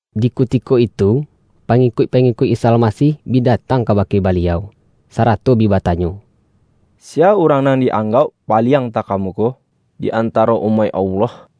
Di kutiko itu, pangikuik-pangi-kuik Isa Almasih bi datang ka-bake Baliau, sarato bi batanyo,”Siya urang nan di-anggauk paliang taka-muko, di antaro umaik Allah?”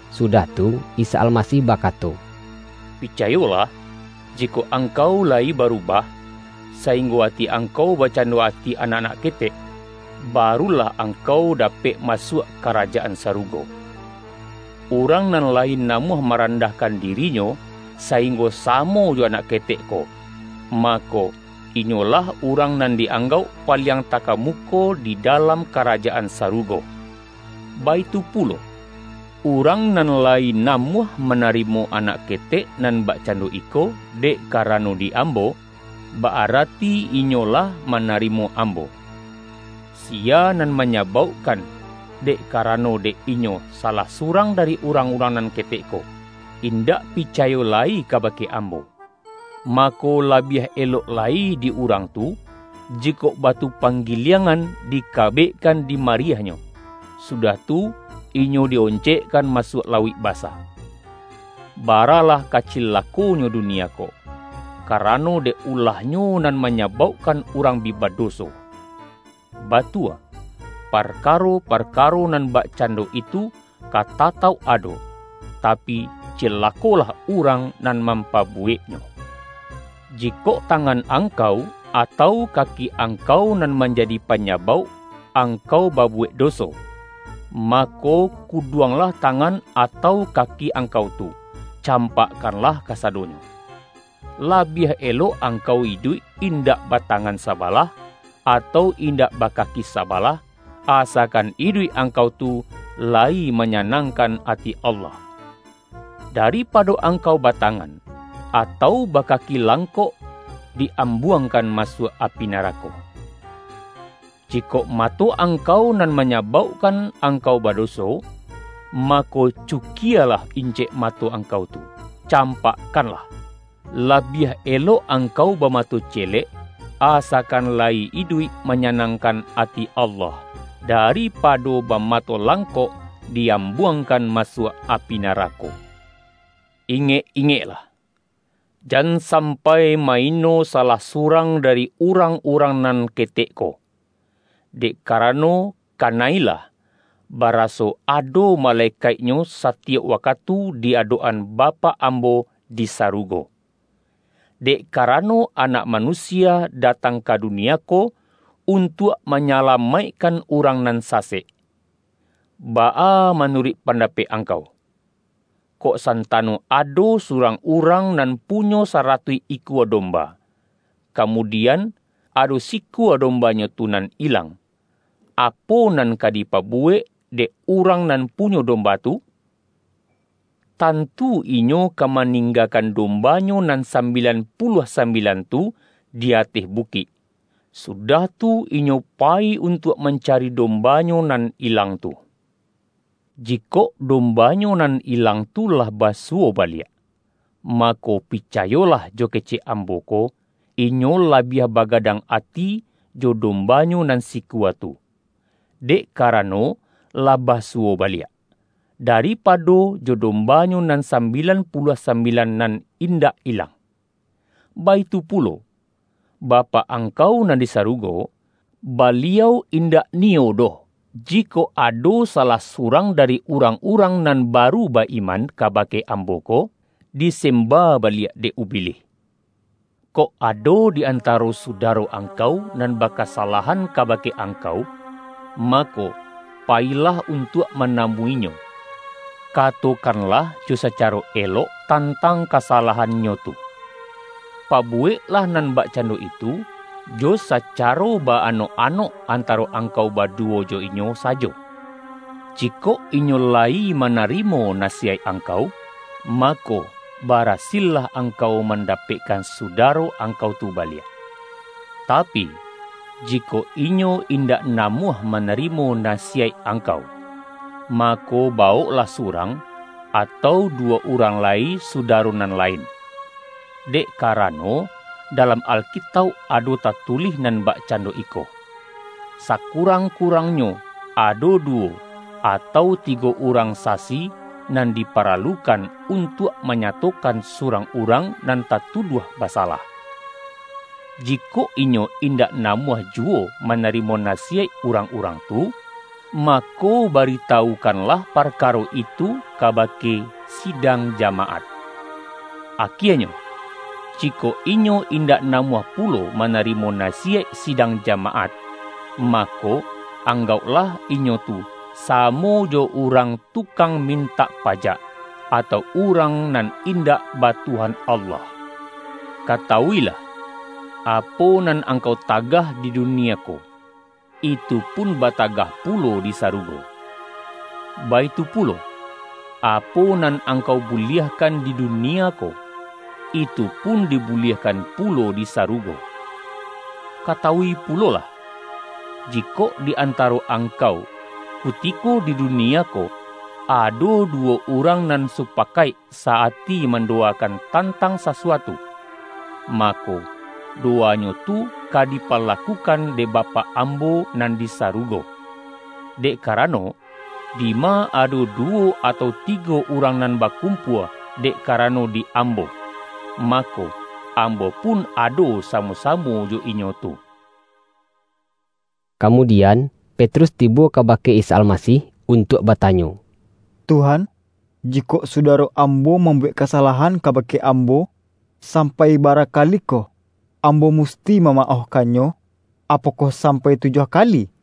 Sudah tu, Isa Almasih bakato,”Picayolah! Jikok angkau layi baru-bah, sainggo ati angkau bakcando ati anak-anak ketek, barulah angkau da-pek masuak Karajaan Sarugo. Urang nan layi namuah marandahkan diri-nyo, sainggo samo jo anak ketek ko, mako, inyolah urang nan di-anggauk paliang takamuko di dalam Karajaan Sarugo. Baitu pulo, urang nan layi na-muah manarimo anak ketek nan bak-cando iko, dek karano di Ambo, ba-arati inyo lah manarimo Ambo.” ”Siya nan manyabaukkan, dek ka-rano dek inyo salah surang dari urang-urang nan ketek ko, indak picayo lai kabake Ambo, mako, labiah elok lai di urang tu, jikok batu panggiliangan dika-bekkan di mariahnyo, sudah tu inyo di-oncekkan masuak lauik basa. Baralah ka cilakonyo dunia ko, karano dek ulah-nyo nan manyabaukkan urang bi ba-doso. Batua, parkaro-parkaro nan bak-cando itu ka tatauk ado, tapi, cilakolah urang nan mampabuweknyo! Jikok tangan angkau, atau kaki ang-kau nan manjadi panyabauk angkau ba-buwek doso, mako, kuduanglah tangan atau kaki angkau tu, campakkanlah ka-sadonyo. Labiah elok angkau iduik in-dak batangan sabalah, atau indak ba-kaki sabalah, asakan iduik angkau tu layi manyanangkan ati Allah. Daripado angkau batangan, atau bakaki langkok di-ambuangkan masuak api narako. Jikok mato angkau nan manyabauk-kan angkau badoso, mako, cukialah incek mato angkau tu, campakkanlah. Labiah elok angkau bamato celek, asa-kan layi iduik manyanangkan ati Allah, daripado bamato langkok di-ambuang-kan masuak api narako.” ”Ingek-ingeklah! Jan sampai ma-ino salah surang dari urang-urang nan ketek ko. Dek karano, kana-ilah, bara-so ado malekaiknyo satiyok wakatu di adok-an Bapak Ambo di sarugo. Dek karano, Anak Manusia da-tang ka dunie ko, untuak manyala-maikkan urang nan sasek!] Baa manuruik pandapek angkau? Kok santano ado surang urang nan punyo saratuih ikua domba, kamudian ado sikua dombanyo tu nan ilang, apo nan ka dipabuwek dek urang nan pu-nyo domba tu? Tantu inyo ka maning-gakan dombanyo nan sambilan puluah sambilan tu di ateh bukik, sudah tu inyo payi untuak mancari dombanyo nan ilang tu. Jikok dombanyo nan ilang tu lah basuwo baliak mako, pi-cayolah jo kecek Ambo ko inyo la-biah bagadang ati jo dombanyo nan sikua tu, dek karano lah basuwo ba-liak, daripado jo dombanyo nan sambi-lan puluah sambilan nan indak ilang. Baitu pulo, Bapak angkau nan di sa-rugo, Baliau indak niyo doh, jikok ado salah surang dari urang-urang nan ba-ru ba-iman kabake Ambo ko, disem-ba baliak dek ubilih.” ”Kok ado di antaro sudaro angkau, nan bakasalahan kabake angkau, ma-ko, payilah untuak manamuinyo, kato-kanlah jo sacaro elok tantang kasalah-annyo tu. Pabuweklah nan bakcando itu, jo sacaro ba-anok-anok antaro ang-kau baduwo jo inyo sajo. Jikok inyo la-yi manarimo nasiyaik angkau, mako, barasillah angkau mandapekkan suda-ro angkau tu baliak. Tapi, jikok inyo indak namuah manarimo nasiyaik ang-kau, mako, bawoklah surang, atau du-wo urang lai sudaro nan lain. Dek ka-rano, dalam Alkitauk ado tatulih nan bakcando iko, ’Sakurang-kurangnyo ado duwo, atau tigo urang sasi nan di-paralukan, untuak manyatokan surang urang nan tatuduah basalah.’ Jikok inyo indak namuah juwo ma-narimo nasiyaik urang-urang tu, ma-ko baritawukanlah parkaro itu kaba-ke sidang jamaat. Akienyo, jikok inyo indak namuah pulo manarimo nasi-yaik sidang jamaat, mako, anggauk-lah inyo tu samo jo urang tukang min-tak pajak, atau urang nan indak ba Tuhan Allah.” ”Katawuilah: Apo nan angkau ta-gah di dunie ko, itupun batagah pulo di sarugo. Baitu pulo, apo nan angkau buliahkan di dunie ko, itupun dibu-liahkan pulo di sarugo. Katawui pulolah: Jikok di antaro angkau kutiko di dunie ko, ado duwo urang nan supakaik sa-ati mandowa-kan tantang sasuatu, mako, dowanyo tu ka dipalakukan dek Bapak Ambo nan di sarugo. Dek karano, dima ado duwo, atau tigo urang nan bakumpua, dek karano di Ambo, mako, Ambo pun ado samo-samo jo inyo tu.” Kamudian, Petrus tibo kabake Isa Almasih untuak batanyo,”Tuhan, ji-kok sudaro ambo mambuwek kasa-lahan kabake ambo, sampai bara ka-likoh, ambo musti mamaohkannyo? Apokoh sampai tujuah kali?”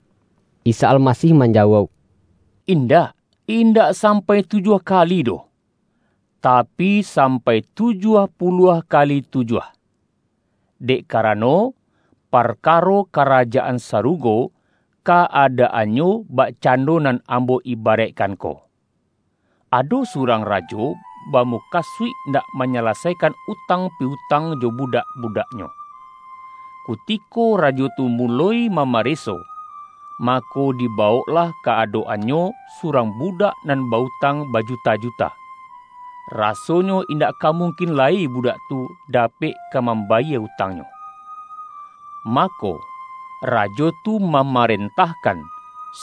Isa Almasih manjawauk,”Indak, indak sampai tujuah kali doh, tapi, sampai tujuah puluah kali tujuah. Dek karano, parkaro Karajaan Sa-rugo, ka-adaannyo bakcando nan Ambo ibaraikkan ko: Ado surang rajo bamu-kasuik nak manyalasaikan utang pi-utang jo budak-budaknyo. Kutiko rajo tu muloi mamareso, mako, diba-woklah ka adok-annyo surang budak nan ba-utang bajuta-juta, rasonyo indak ka mungkin lai budak tu da-pek ka mambayie utangnyo. Mako, rajo tu mamarentahkan,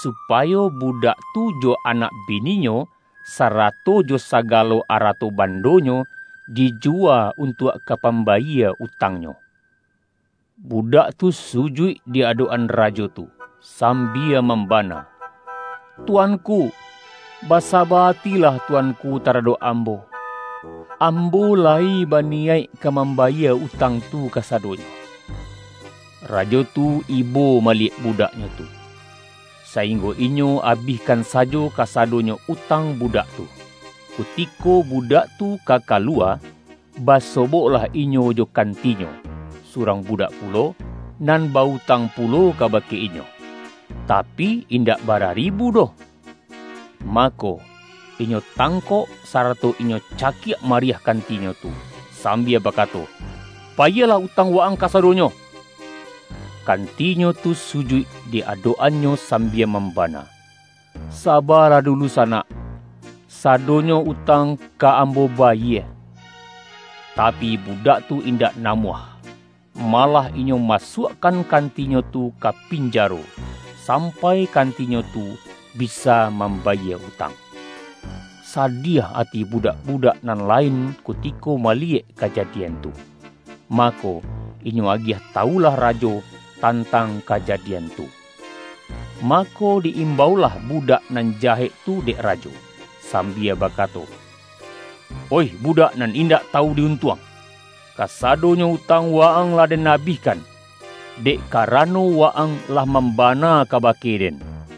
supayo bu-dak tu jo anak bininyo, sarato jo saga-lo arato bandonyo, dijuwa untuak ka pambayie utangnyo. Budak tu su-juik di adok-an rajo tu, sambia mam-bana, ’Tuanku, basaba atilah tuanku taradok ambo. Ambo layi baniyaik ka mambayie utang tu kasadonyo.’ Rajo tu ibo maliyek budaknyo tu, sainggo inyo abihkan sajo kasadonyo utang budak tu. Kutiko budak tu ka kaluwa, ba-soboklah inyo jo kantinyo, surang bu-dak pulo, nan ba-utang pulo kabake inyo, tapi, indak bara ribu doh. Ma-ko, inyo tangkok, sarato inyo cakiak mariah kantinyo tu, sambia bakato, ’Bayielah utang wa-ang kasadonyo!’ Kantinyo tu sujuik di adok-annyo sambia mambana, ’Sabalah dulu sa-nak, sadonyo utang ka ambo bayie!’ Tapi, budak tu indak namuah. Malah inyo masuakkan kantinyo tu ka pinja-ro, sampai kantinyo tu bisa mambayie utang. Sadiah ati budak-budak nan lain kutiko maliyek kajadian tu, mako, inyo agiah tawulah rajo tantang kaja-dian tu. Mako, di-imbaulah budak nan jahek tu dek rajo, sambia bakato, ’Oih budak nan indak tawu di untuang! Kasadonyo utang wa-ang lah den abih-kan, dek karano wa-ang lah mamba-na kabake den.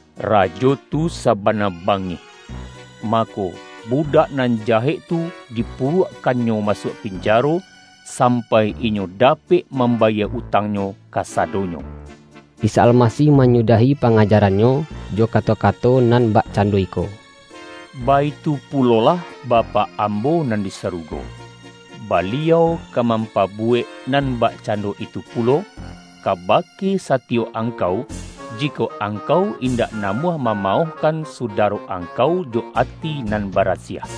Rajo tu sa-bana bangih. Mako, budak nan jahek tu dipuruakkannyo masuak pinjaro, sampai inyo dapek mambayie utang-nyo kasadonyo.” Isa Almasih manyudahi panga-jaran-Nyo jo kato-kato nan bakcan-do iko,”Baitu pulolah Bapak Ambo nan di sarugo, Baliau ka mampabu-wek nan bakcando itu pulo, kabake satiyok angkau, jikok angkau indak namuah mamaohkan sudaro angkau jo ati nan bara siah.”